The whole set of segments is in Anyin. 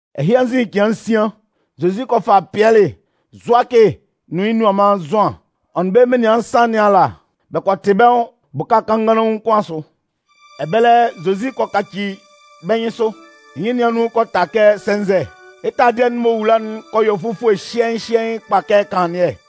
Ɛhɩ anzin cɩan nsian, Zozi kɔ fa Pɩɛlɩ, Zʋakɩ nʋn yɩ́ nianman Zʋan. Ɔ nʋn bɛ́ menian nsan nɩn ala bɛ kɔ tɩ bɛ́ nwʋn bʋka kannganlaun kʋn asʋ. Ɛbɛlɛ, Zozi kɔ kaci bɛ́ nyɩnsʋ. Yɩ́ nyɩn nɩn anun kɔ ta kɛ sɛnzɛ, yɩ́ taladɩɛ'n m'ɔ wula'n kɔ yɔ fufue hyɩɛɩn hyɩɛɩn kpa kɛ kanlannɩɛ.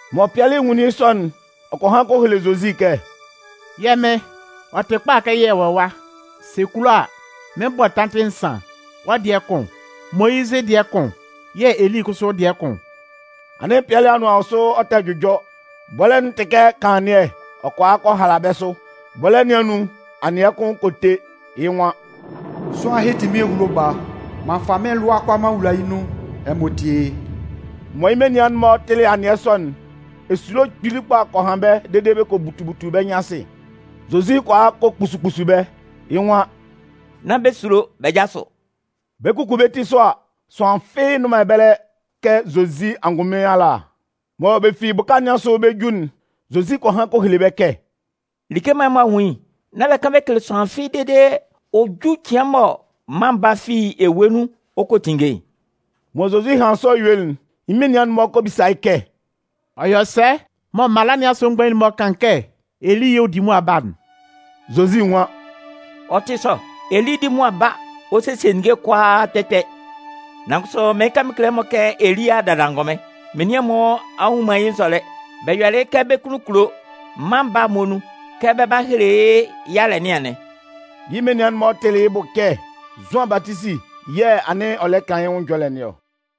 Mɔ Pɩɛlɩ nwunlin yɩ́ sɔ'n, ɔ kɔ han kɔ hele Zozi kɛ: “Yɛ́ Mɩn, ɔ tɩ kpa kɛ yɛ wɔ ɛwa. Sɛ ɛ kulo a, mɩn 'bɔ tantɩ nsan. Wɔ́ dɩɛ kʋn, Moyizɩ dɩɛ kʋn yɛ̂ Eli kʋsʋ dɩɛ kʋn.” Anɩn Pɩɛlɩ anʋan wɔ sʋ ɔ tɛ jʋjɔ, bɔlɛ́'n tɩ kɛ kanlannɩɛ, ɔ kɔ a kɔ hala bɛ́ sʋ. Bɔlɛ́ nɩn anun, anɩɛ kʋn kɔ te, yɩ́ nwan: “Sʋanlan ɛhɩ tɩ mɩ́n ehulo Baa. M'an fa mɩ́n lʋa'n kʋalaa m'an wula yɩ́ nun. Ɛmɔ tíe yɩ́!” Mɔ yɩ́ menian'n-mɔ tɩlɩ anɩɛ sɔ'n, esulo kpili kpa kɔ han bɛ́ dede bɛ kɔ butu butu bɛ́ nyɩn asɩ. Zozi kɔ a kɔ kpusu kpusu bɛ́, yɩ́ nwan: “Nán bɛ sulo, bɛ jásʋ.” Bɛ 'kuku bɛ́ ti sʋ a, sʋanlan fɩ́ɩ́ nnʋn man ɛbɛlɛ kɛ Zozi angʋnmɩn ala. Mɔ bɛ fi bʋka nɩn asʋ bɛ 'ju'n, Zozi kɔ han kɔ hele bɛ́ kɛ: “Like mɔ ɛmɔ a nwun yɩ́'n, nán bɛ kan bɛ kele sʋanlan fɩ́ɩ́ dede ɔ 'ju cɩan mɔ Mân Baa'n fi ewue nun ɔ kɔ tinnge'n.” Mɔ Zozi hanlɩn sɔ yuelɩ'n, yɩ́ menian'n-mɔ kɔ bisa yɩ́ kɛ: “Ɔ yɔ sɛ mɔ mala nɩn asʋ mgbain'n-mɔ kan kɛ Eli yɛ̂ ɔ 'di mʋa ba'n?” Zozi nwan: “Ɔ tɩ sɔ, Eli 'di mʋa ba ɔ sesie ninnge'n kʋalaa kpɛ kpɛ. Nan kʋsʋ mɩɩn kan mɩn kele ɛmɔ kɛ Eli a a dada angʋnmɩn. Menian'n-mɔ a nnwun man yɩ́ nzɔlɛ, bɛ yɔlɩ yɩ́ kɛ bɛ́ kunnun kulo. Mân Baa'n muonun, kɛ bɛ 'ba hele yɩ́ yalɛ nɩn anɩn.” Yɩ́ menian'n-mɔ tɩlɩ yɩ́ bʋ kɛ Zʋan Batisi yɛ̂ anɩn ɔ lɛ kan yɩ́ nwʋn ɛjɔlɛ nɩn ɔ.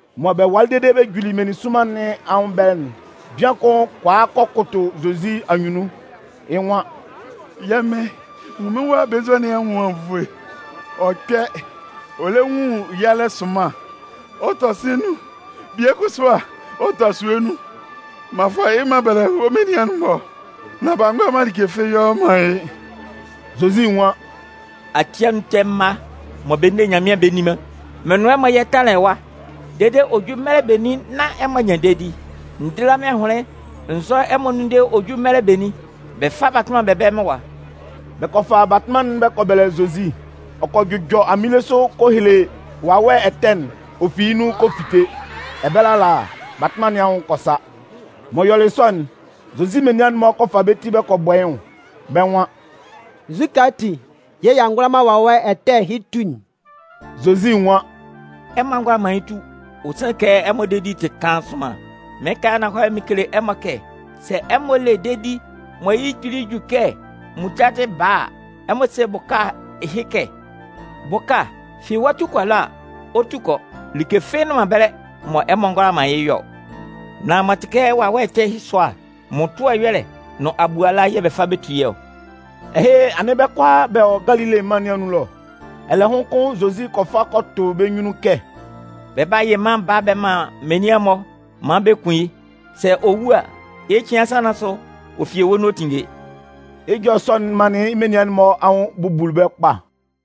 Mɔ bɛ walɩ dede bɛ juli meninsʋnman nɩn anwʋn ɛbɛlɛ'n, bian kʋn kɔ a kɔ kʋtʋ Zozi anyunnun, yɩ́ nwan: “Yɛ́ Mɩ́n, nwun mɩ́n wa belenzua nɩn anwʋn anwunnvoe. Ɔ kpɛ, ɔ lɛ nwun yalɛ sʋnman, ɔ tɔ sɩ̂n nun, bie kʋsʋ a, ɔ tɔ asue nun. M'an fa yɩ́ m'an bɛlɛ wɔ́ menian'n-mɔ, nan b'a ngʋala man like fɩ́ɩ́ yɔ man yɩ́.” Zozi nwan: “Ati anun ɛtɛ mma mɔ bɛ nne man Nyanmɩan bɛ nni man, mɩn nʋn ɛmɔ yɛ tánlan ɛwa dede ɔ hɔ́ jú mɛlɛ benin nán ɛmɔ a nyan dedi? N díla mɩ́n ahʋnlɩn n zʋ́ ɛmɔ dede ɔ jú mɛlɛ benin? Bɛ fá batʋnman'n bɛ bɛ́lɛ mɩ́n ɛwa.” Bɛ kɔ fa batʋnman'n bɛ kɔ bɛlɛ Zozi. Ɔ kɔ jʋjɔ aminle sʋ ɔ kɔ hele wawɛ ɛtɛ'n. Ɔ fi yɩ́ nun kɔ fite. Ɛbɛlɛ ala, batʋnman nɩn anwʋn kɔ sa. M'ɔ yɔlɩ sɔ'n, Zozi menian'n-mɔ kɔ fa bɛ́ ti bɛ kɔ bɔ yɩ́ nwʋn, bɛ́ nwan: “Nzukɛ ati yɛ̂ y'a ngʋala man wawɛ ɛtɛ ɛhɩ tu'n?” Zozi nwan: “Ɛmɔ a ngʋala man yɩ́ tu, ɔ sanlɩn kɛ ɛmɔ dedi'n tɩ kaan sʋnman. Mɩɩn kan yɩ́ ananhɔlɛ mɩn kele ɛmɔ kɛ sɛ ɛmɔ le dedi mɔ yɩ́ kpili ju kɛ muntadɩ baa a, ɛmɔ se bʋka ɛhɩ kɛ: ‘Bʋka, fi ɛwa tu kɔ ɛlɔ’ a, ɔ 'tu kɔ. Like fɩ́ɩ́ nnʋn man ɛbɛlɛ mɔ ɛmɔ ngɔ hʋala man yɩ́ yɔ ɔ. [ Nan m'ɔ tɩ kɛ wawɛ ɛtɛ ɛhɩ sʋa'n, mmʋtʋɛ ɛyɔlɛ nʋn abuala yɛ̂ bɛ fa bɛ tu yɩ́ ɔ.”] Ɛhɩ, anɩn bɛ́ kʋalaa bɛ wɔ Galile mân nɩn anun ɛlɔ. Ɛlɛhʋn kʋn Zozi kɔ fa kɔ tʋ bɛ́ nyunnun kɛ: “Bɛ 'ba yɩ Mân Baa'n bɛ man menian'n-mɔ maan bɛ kun yɩ́. Sɛ ɔ wu a, yɩ́ cɩan nsan nɩn asʋ, ɔ fi ewue nun ɔ 'tinnge.” Yɩ́ ɛjɔlɛ sɔ'n manlɩn yɩ́ menian'n-mɔ anwʋn bubuli bɛ́ kpa.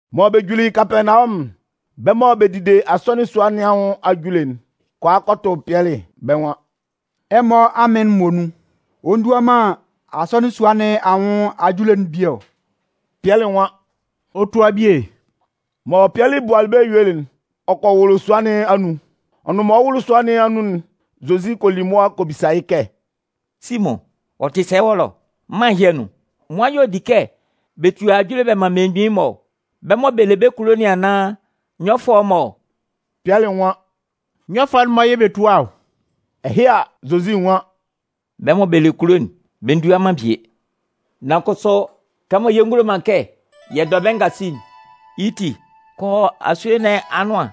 Mɔ bɛ juli Kapɛɛnawɔmʋn'n, bɛ́ mɔ bɛ dide asɔnɩn sua nɩn anwʋn ajule'n kɔ a kɔ tʋ Pɩɛlɩ, bɛ́ nwan: “Ɛmɔ amɩn'n muonun, ɔ ndua man asɔnɩn sua nɩn anwʋn ajule'n bie ɔ?” Pɩɛlɩ nwan: “Ɔ tua bie.” Mɔ Pɩɛlɩ bualɩ bɛ́ yuelɩ'n, ɔ kɔ wʋlʋ sua nɩn anun. Ɔ nʋn mɔ ɔ 'wʋlʋ sua nɩn anun'n, Zozi kɔ li mʋa kɔ bisa yɩ́ kɛ: “Simʋn, ɔ tɩ sɛ wɔ́ ɛlɔ? Mân ɛhɩ anun, nwan-mɔ y'ɔ di kɛ bɛ tua ajule bɛ man mmelemgbin'n-mɔ ɔ? Bɛ́ mɔ bɛ le bɛ́ kulo nɩn naan, nyɔfʋɛ'n-mɔ ɔ?” Pɩɛlɩ nwan: “Nyɔfʋɛ'n-mɔ yɛ̂ bɛ tua ɔ.” Ɛhɩ a, Zozi nwan: “Bɛ́ mɔ bɛ le bɛ́ kulo'n, bɛ ndua man bie. Nan kʋsʋ kɛmɔ yɛ ngulo man kɛ yɛ dɔ bɛ́ ngasi'n, yɩ́ ti kɔ asue nɩn anʋan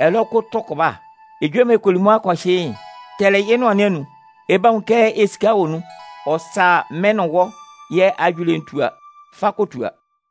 ɛlɔ kɔ tʋ kʋba. Ejue mɔ ɛ kɔ li mʋa kɔ hyɩ yɩ́'n, tɛlɛ yɩ́ nʋan nɩn anun. Ɛ 'ba nwun kɛ esika wɔ nun, ɔ sa mɩ́n nʋn wɔ́ yɛ́ ajule'n tua. Fa kɔ tua.”